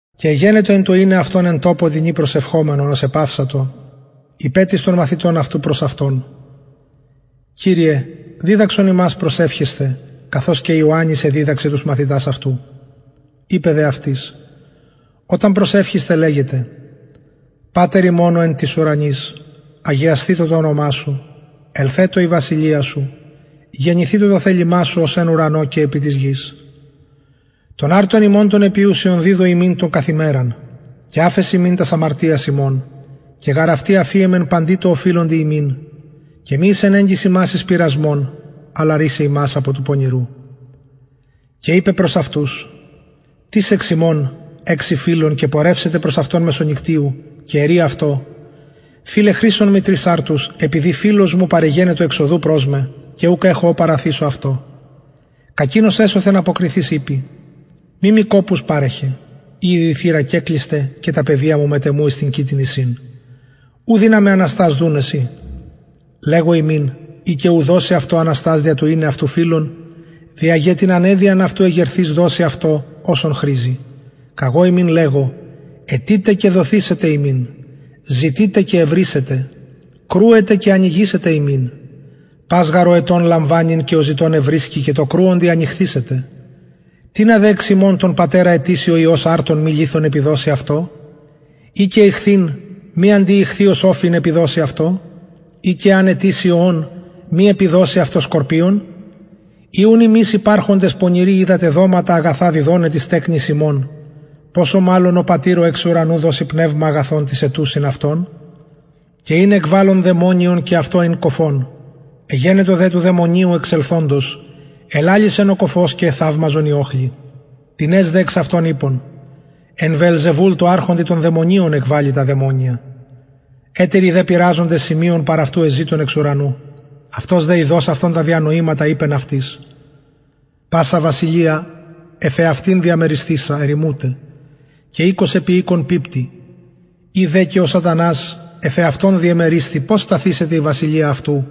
και εγενετο εν τω ειναι αυτον εν τοπω τινι προσευχομενον ως επαυσατο ειπεν τις των μαθητων αυτου προς αυτον κυριε διδαξον ημας προσευχεσθαι καθως και ιωαννης εδιδαξεν τους μαθητας αυτου ειπεν δε αυτοις οταν προσευχησθε λεγετε πατερ ημων ο εν τοις ουρανοις αγιασθητω το ονομα σου ελθετω η βασιλεια σου γενηθητω το θελημα σου ως εν ουρανω και επι της γης τον αρτον ημων τον επιουσιον διδου ημιν το καθ ημεραν και αφες ημιν τας αμαρτιας ημων και γαρ αυτοι αφιεμεν παντι οφειλοντι ημιν και μη εισενεγκης ημας εις πειρασμον αλλα ρυσαι ημας απο του πονηρου και ειπεν προς αυτους τις εξ υμων εξει φιλον και πορευσεται προς αυτον μεσονυκτιου και ειπη αυτω φιλε χρησον μοι τρεις αρτους επειδη φιλος παρεγενετο εξ οδου προς με και ουκ εχω ο παραθησω αυτω κακεινος εσωθεν αποκριθεις ειπη μη μοι κοπους παρεχε ηδη η θυρα κεκλεισται και τα παιδια μου μετ εμου εις την κοιτην εισιν ου δυναμαι αναστας δουναι σοι λεγω υμιν ει και ου δωσει αυτω αναστας δια το ειναι αυτου φιλον δια γε την αναιδειαν αυτου εγερθεις δωσει αυτω οσον χρηζει καγω υμιν λεγω αιτειτε και δοθησεται υμιν ζητειτε και ευρησετε κρουετε και ανοιγησεται υμιν πας γαρ ο αιτων λαμβανει και ο ζητων ευρισκει και τω κρουοντι ανοιγησεται τινα δε υμων τον πατερα αιτησει ο υιος αρτον μη λιθον επιδωσει αυτω η και ιχθυν μη αντι ιχθυος οφιν επιδωσει αυτω η και εαν αιτηση ωον μη επιδωσει αυτω σκορπιον ει ουν υμεις πονηροι υπαρχοντες οιδατε δοματα αγαθα διδοναι τοις τεκνοις υμων ποσω μαλλον ο πατηρ ο εξ ουρανου δωσει πνευμα αγιον τοις αιτουσιν αυτον και ην εκβαλλων δαιμονιον και αυτο ην κωφον εγενετο δε του δαιμονιου εξελθοντος ελαλησεν ο κωφος και εθαυμασαν οι οχλοι τινες δε εξ αυτων ειπον εν βεελζεβουλ αρχοντι των δαιμονιων εκβαλλει τα δαιμονια ετεροι δε πειραζοντες σημειον παρ αυτου εζητουν εξ ουρανου αυτος δε ειδως αυτων τα διανοηματα ειπεν αυτοις πασα βασιλεια εφ εαυτην διαμερισθεισα ερημουται και οικος επι οικον πιπτει ει δε και ο σατανας εφ εαυτον διεμερισθη πως σταθησεται η βασιλεια αυτου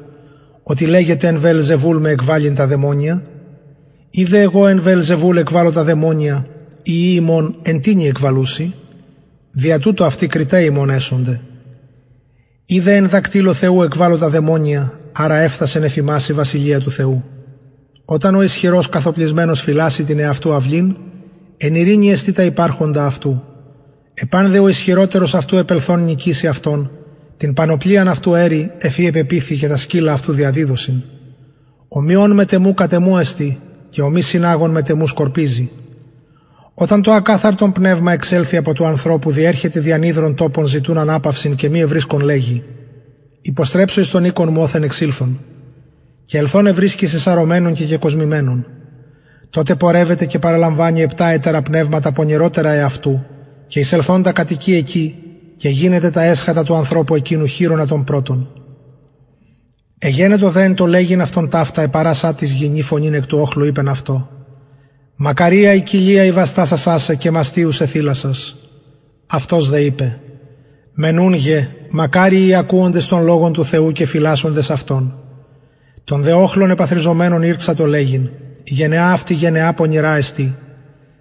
οτι λεγετε εν βεελζεβουλ εκβαλλειν με τα δαιμονια ει δε εγω εν βεελζεβουλ εκβαλλω τα δαιμονια οι υιοι υμων εν τινι εκβαλλουσιν δια τουτο κριται υμων αυτοι εσονται ει δε εν δακτυλω θεου εκβαλλω τα δαιμονια αρα εφθασεν εφ υμας η βασιλεια του θεου οταν ο ισχυρος καθωπλισμενος φυλασση την εαυτου αυλην εν ειρηνη εστιν τα υπαρχοντα αυτου επαν δε ο ισχυροτερος αυτου επελθων νικηση αυτον την πανοπλιαν αυτου αιρει εφ η επεποιθει και τα σκυλα αυτου διαδιδωσιν ο μη ων μετ εμου κατ εμου εστιν και ο μη συναγων μετ εμου σκορπιζει οταν το ακαθαρτον πνευμα εξελθη απο του ανθρωπου διερχεται δι ανυδρων τοπων ζητουν αναπαυσιν και μη ευρισκον λεγει υποστρεψω εις τον οικον μου οθεν εξηλθον και ελθον ευρισκει σεσαρωμενον και κεκοσμημενον τοτε πορευεται και παραλαμβανει επτα ετερα πνευματα πονηροτερα εαυτου και ελθοντα κατοικει εκει και γινεται τα εσχατα του ανθρωπου εκεινου χειρονα των πρωτων εγενετο δε εν τω λεγειν αυτον ταυτα επαρασα τις γυνη φωνην εκ του οχλου ειπεν αυτω μακαρια η κοιλια η βαστασασα σε και μαστοι ους εθηλασας αυτος δε ειπεν μενουνγε μακαριοι οι ακουοντες τον λογον του θεου και φυλασσοντες αυτον των δε οχλων επαθροιζομενων ηρξατο λεγειν η γενεα αυτη πονηρα εστιν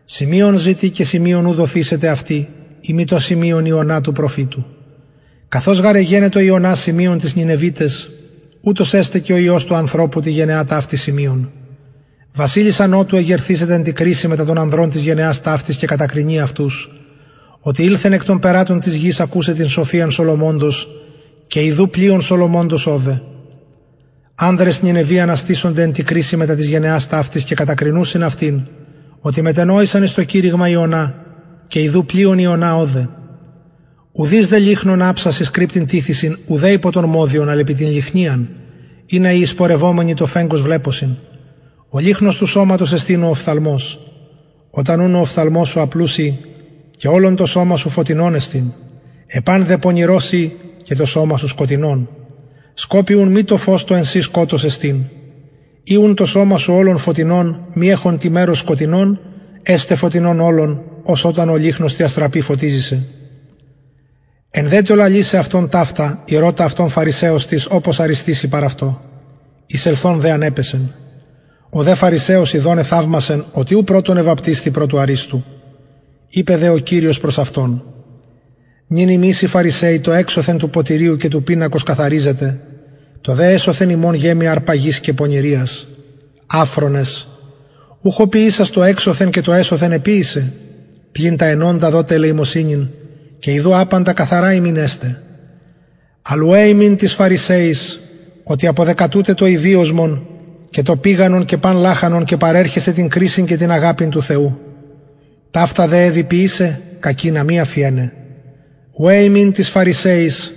σημειον επιζητει και σημειον ου δοθησεται αυτη ει μη το σημειον ιωνα του προφητου καθως γαρ εγενετο ιωνας σημειον τοις νινευιταις ουτως εσται και ο υιος του ανθρωπου τη γενεα ταυτη βασιλισσα νοτου εγερθησεται εν τη κρισει μετα των ανδρων της γενεας ταυτης και κατακρινει αυτους οτι ηλθεν εκ των περατων της γης ακουσαι την σοφιαν σολομωνος και ιδου πλειον σολομωνος ωδε ανδρες νινευι αναστησονται εν τη κρισει μετα της γενεας ταυτης και κατακρινουσιν αυτην οτι μετενοησαν εις το κηρυγμα ιωνα και ιδου πλειον ιωνα ωδε ουδεις δε λυχνον αψας εις κρυπτην τιθησιν ουδε υπο τον μοδιον αλλ επι την λυχνιαν ινα οι εισπορευομενοι το φεγγος βλεπωσιν ο λυχνος του σωματος εστιν ο οφθαλμος οταν ουν ο οφθαλμος σου απλους η και ολον το σωμα σου φωτεινον εστιν επαν δε πονηρος η και το σωμα σου σκοτεινον σκοπει ουν μη το φως το εν σοι σκοτος εστιν ει ουν το σωμα σου ολον φωτεινον μη εχον τι μερος σκοτεινον εσται φωτεινον ολον ως οταν ο λυχνος τη αστραπη φωτιζη σε εν δε τω λαλησαι ηρωτα αυτον φαρισαιος τις οπως αριστηση παρ αυτω εισελθων δε ανεπεσεν ο δε φαρισαιος ιδων εθαυμασεν οτι ου πρωτον εβαπτισθη προ του αριστου ειπεν δε ο κυριος προς αυτον νυν υμεις οι φαρισαιοι το εξωθεν του ποτηριου και του πινακος καθαριζετε το δε εσωθεν υμων γεμει αρπαγης και πονηριας αφρονες ουχ ο ποιησας το εξωθεν και το εσωθεν εποιησεν πλην τα ενοντα δοτε ελεημοσυνην και ιδου παντα καθαρα υμιν εστιν αλλ ουαι υμιν τοις φαρισαιοις οτι αποδεκατουτε το ηδυοσμον και το πηγανον και παν λαχανον και παρερχεσθε την κρισιν και την αγαπην του θεου ταυτα εδει ποιησαι κακεινα μη αφιεναι ουαι υμιν τοις φαρισαιοις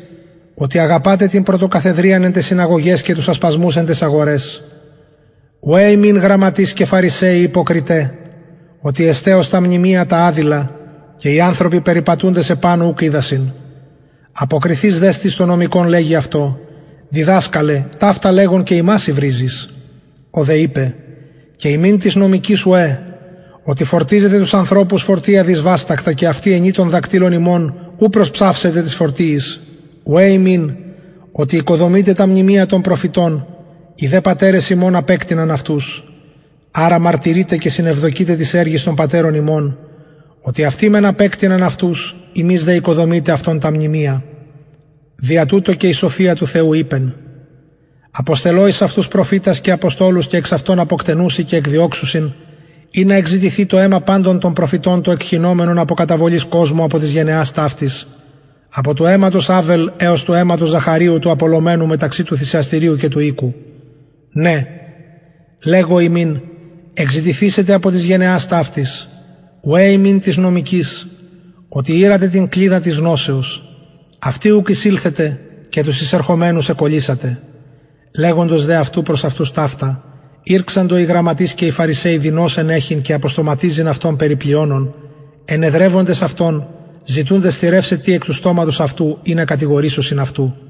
οτι αγαπατε την πρωτοκαθεδριαν εν ταις συναγωγαις και τους ασπασμους εν ταις αγοραις ουαι υμιν γραμματεις και φαρισαιοι υποκριται οτι εστε ως τα μνημεια τα αδηλα και οι ανθρωποι περιπατουντες επανω ουκ οιδασιν αποκριθεις δε τις των νομικων λεγει αυτω διδασκαλε ταυτα λεγων και ημας υβριζεις ο δε ειπεν και υμιν τοις νομικοις ουαι οτι φορτιζετε τους ανθρωπους φορτια δυσβαστακτα και αυτοι ενι των δακτυλων υμων ου προσψαυετε τοις φορτιοις ουαι υμιν οτι οικοδομειτε τα μνημεια των προφητων οι δε πατερες υμων απεκτειναν αυτους αρα μαρτυρειτε και συνευδοκειτε τοις εργοις των πατερων υμων οτι αυτοι μεν απεκτειναν αυτους υμεις δε οικοδομειτε αυτων τα μνημεια δια τουτο και η σοφια του θεου ειπεν αποστελω εις αυτους προφητας και αποστολους και εξ αυτων αποκτενουσιν και εκδιωξουσιν ινα εκζητηθη το αιμα παντων των προφητων το εκχυνομενον απο καταβολης κοσμου απο της γενεας ταυτης απο του αιματος αβελ εως του αιματος ζαχαριου του απολομενου μεταξυ του θυσιαστηριου και του οικου ναι λεγω υμιν εκζητηθησεται απο της γενεας ταυτης ουαι υμιν τοις νομικοις οτι ηρατε την κλειδα της γνωσεως αυτοι ουκ εισηλθετε και τους εισερχομενους εκωλυσατε λεγοντος δε αυτου ταυτα προς αυτους ηρξαντο οι γραμματεις και οι φαρισαιοι δεινως ενεχειν και αποστοματιζειν αυτον περι πλειονων ενεδρευοντες αυτον ζητουντες θηρευσαι τι εκ του στοματος αυτου ινα κατηγορησωσιν αυτου